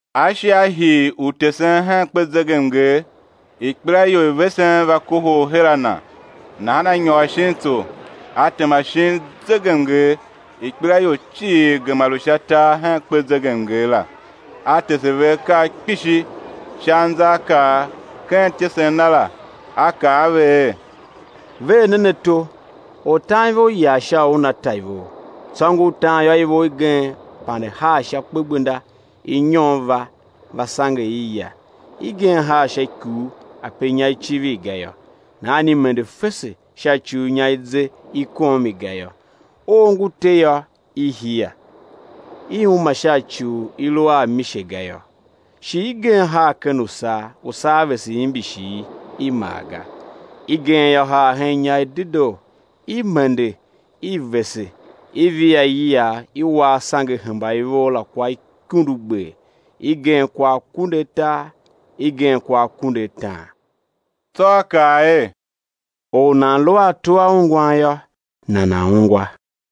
A shi A hii u tesen hen kpezegemnger, ikpelaior i vesen va kohol her a Na, nahan A nyôr shin tsô, A tema shin zegemnger; ikpelaior cii gema lu sha tar hen kpezegemnger la. A tese ve akaa kpishi sha anzaakaa; ken ityesen Na la, A kaa a ve er: Ver nen ato! Ortanivor yar sha u una ta ivor. Tsô ngur tan yô, ivor igen pande haa sha kpegbenda; inyon va, va sange i, ya. Igen haa sha ikuu ape inya i civir ga yô; nahan i mende fese sha ci u inya i ze i kom i ga yô. Oo ngu te yô, i hia; i uma sha ci u i lu a amise ga yô. Shi igen haa ken usaa, usaa vese imbishi i, i mar ga. Igen yô, haa hen inya i dedoo, i mende i vese i via iyiagh i wa asange hemba ivor la kwa ikundugber, igen kwa akunduatar, igen kwa akunduataan. Tsô A kaa er: Or u nan lu a ato a ungwan yô, nana̱ ungwa.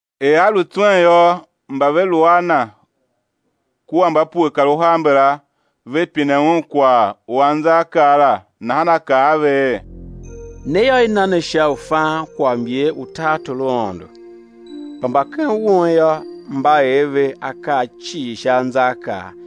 Er a lu tswen yô, mba ve lu a Na kua mba pue kar uhar mbala, ve pine Un kwagh u anzaakaa la. Nahan A kaa a ve er: Ne yô, i na ne sha u fan kwaghmyer u tartor u Aôndo; kpa mba ken won yô, mba er ve akaa cii sha anzaakaa,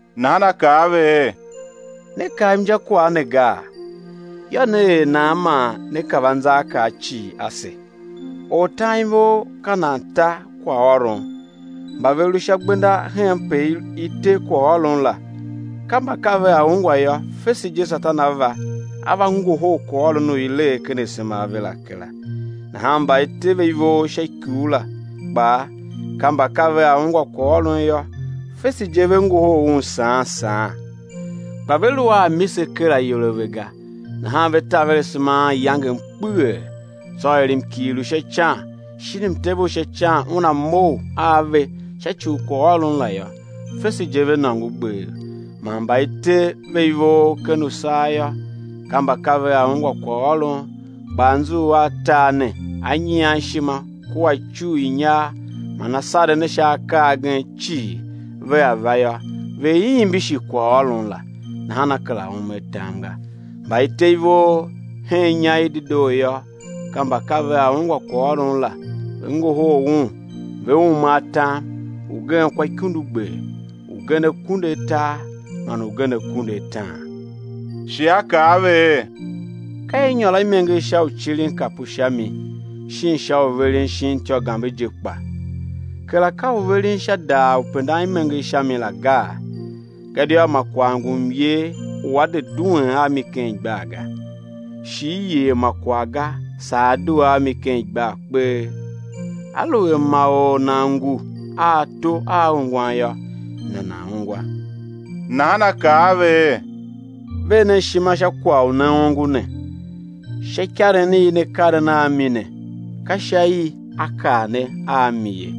Nahan A kaa a ve er: Ne kav injakwagh ne gaa? Yô, né er nan man né kav anzaakaa cii ase? Ortanivor ka nan ta kwaghôron. Mba ve lu sha gbenda henpe i te kwaghôron la, ka mba ka vea ungwa yô, fese je Satan a va, a ngohol kwaghôron u i lee ken asema a ve la kera. Nahan mba i te ve ivor sha ikuu la kpaa, ka mba ka vea ungwa kwaghôron yô, fese je ve ngohol un saan saan, kpa ve lu a mise ker ayol a ve ga, nahan ve taver asema anyangem kpeghee, tsô er mkighir u sha ican shin mtev u sha ican una mough a ve sha ci u kwaghôron la yô, fese je ve nôngo gbev. Man mba i te ve ivor ken usaa yô, ka mba ka vea ungwa kwaghôron, kpa anzughul a tar ne a nyian ishima kua icugh i inyar man asaren a sha akaa agen cii vea va yô, ve imbishi kwaghôron la, nahan a kera ume atam ga. Mba i te ve ivor hen inya i dedoo yô, ka mba ka vea ungwa kwaghôron la, ve ngohol un, ve ume atam, ugen kwa ikundugber, ugen akunduatar man ugen akunduataan. Shi A kaa a ve er: Ka i nyôr a imenger sha u cirin kapu sha mi shin sha u veren shin ityô gambe je kpa? Kera ka u veren sha daar u pendan imenger sha mi la gaa? Gadia ma kwagh ngu myer u á de duen a mi ken igbar ga, shi i yer ma kwagh ga saa á due a mi ken igbar kpee. Aluer ma or nan ngu a ato a ungwan yô, nana̱ ungwa. Nahan A kaa a ve er: Ver nen ishima sha kwagh u ne ongo ne. Sha ikaren i ne karen a mi ne, ka sha i á kar ne a mi ye,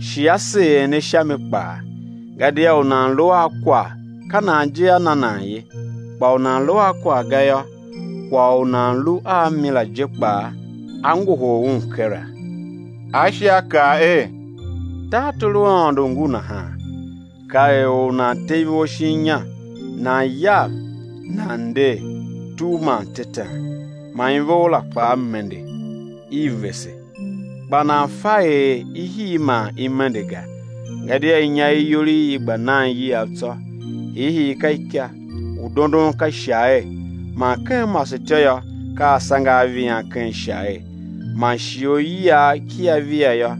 shi á seer ne sha mi kpaa. Gadia u nan lu a kwagh, ka nan je á na nan ye; kpa u nan lu a kwagh ga yô, kwagh u nan lu a mi la je kpaa á ngohol un kera. A shi A kaa er: Tartor u Aôndo ngu nahan: ka er or u nan te ivor shin inya; nan yav, nan nder, tugh man tetan, man ivor la kpaa mende, i vese, kpa nan fa er i hii man i mende ga; gadia inya iyol i i gba nan iyiav tsô; hiihii ka ika, u dondon ka ishagher, man ken masetyô yô, ka asange a vian ken ishagher. Man shighe u iyiagh kia via yô,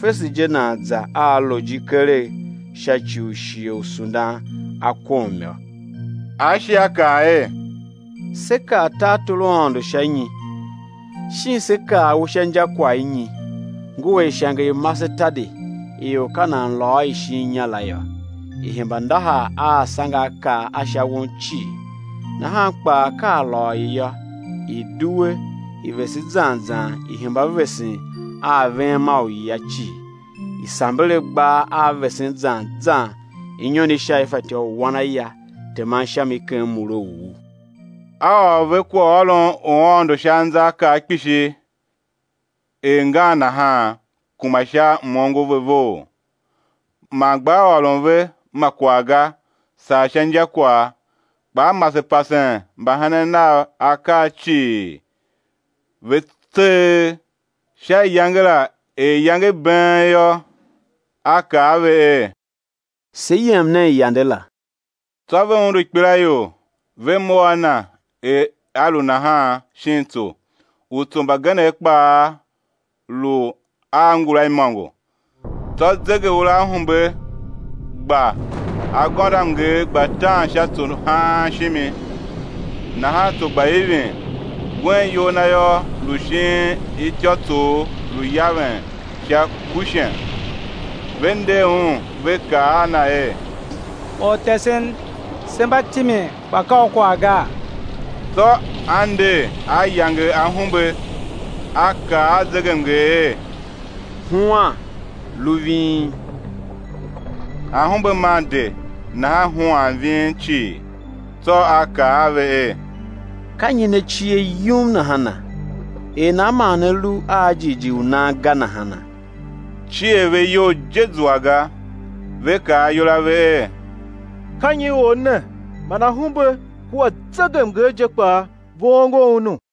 fese je nan za a louji keregh, sha ci u shighe u sundan a kom yô. A shi A kaa er: Sé kar tartor u Aôndo sha nyi, shin sé kar u sha injakwagh i nyi? Ngu er ishange i masetadi i or ka nan lôô i shin inya la yô, i hemba ndahar a asangeakaa a sha won cii; nahan kpaa, ka a lôô i yô, i̱ due, i̱ vese zan zan i̱ hemba vesen a aveghem a uyia cii; i̱ samber agbaa a vesen zan zan inyon i sha i fatyô u wan aya teman sha mi ken mure u u. A ôr ve kwaghôron u Aôndo sha anzaakaa kpishi er ngan nahan, kuma sha m-ongo ve vough. Man gbaa ôron ve ma kwagh ga, saa sha injakwagh. Kpa A mase pasen mbahenen Nav akaa cii, ve tseegh. Sha iyange la, er iyange i been yô, A kaa a ve er: Se yem nen yande la. Tsô ve undu ikpelaior, ve mough a Na er A lu nahan, shin tso; utso mbagenev kpaa lu a ngula imôngo. Tsô zegeuraahumbe gba, agôndoamnger gba tan sha tso haan shimi, nahan tso gba ivin. Un iyol Na yô, lu shin ityôtsoogh, lu yaven sha kushen. Ve nder Un, ve kaa a Na er: Ortesen, se mba timin kpa ka U kwagh gaa? Tsô a nder, A yange ahumbe, A kaa a zegemnger er: Huan, lu ving! Ahumbe maa de, nahan huan ving cii. Tsô A kaa a ve er: Ka nyi ne cie yum nahana? Er nan man ne lu a jighjigh u nan ga nahana? Cier ve iyol je zua ga, ve kaa ayol a ve er: Ka nyi Or ne man ahumbe kua zegemnger je kpaa ve ongo Unu?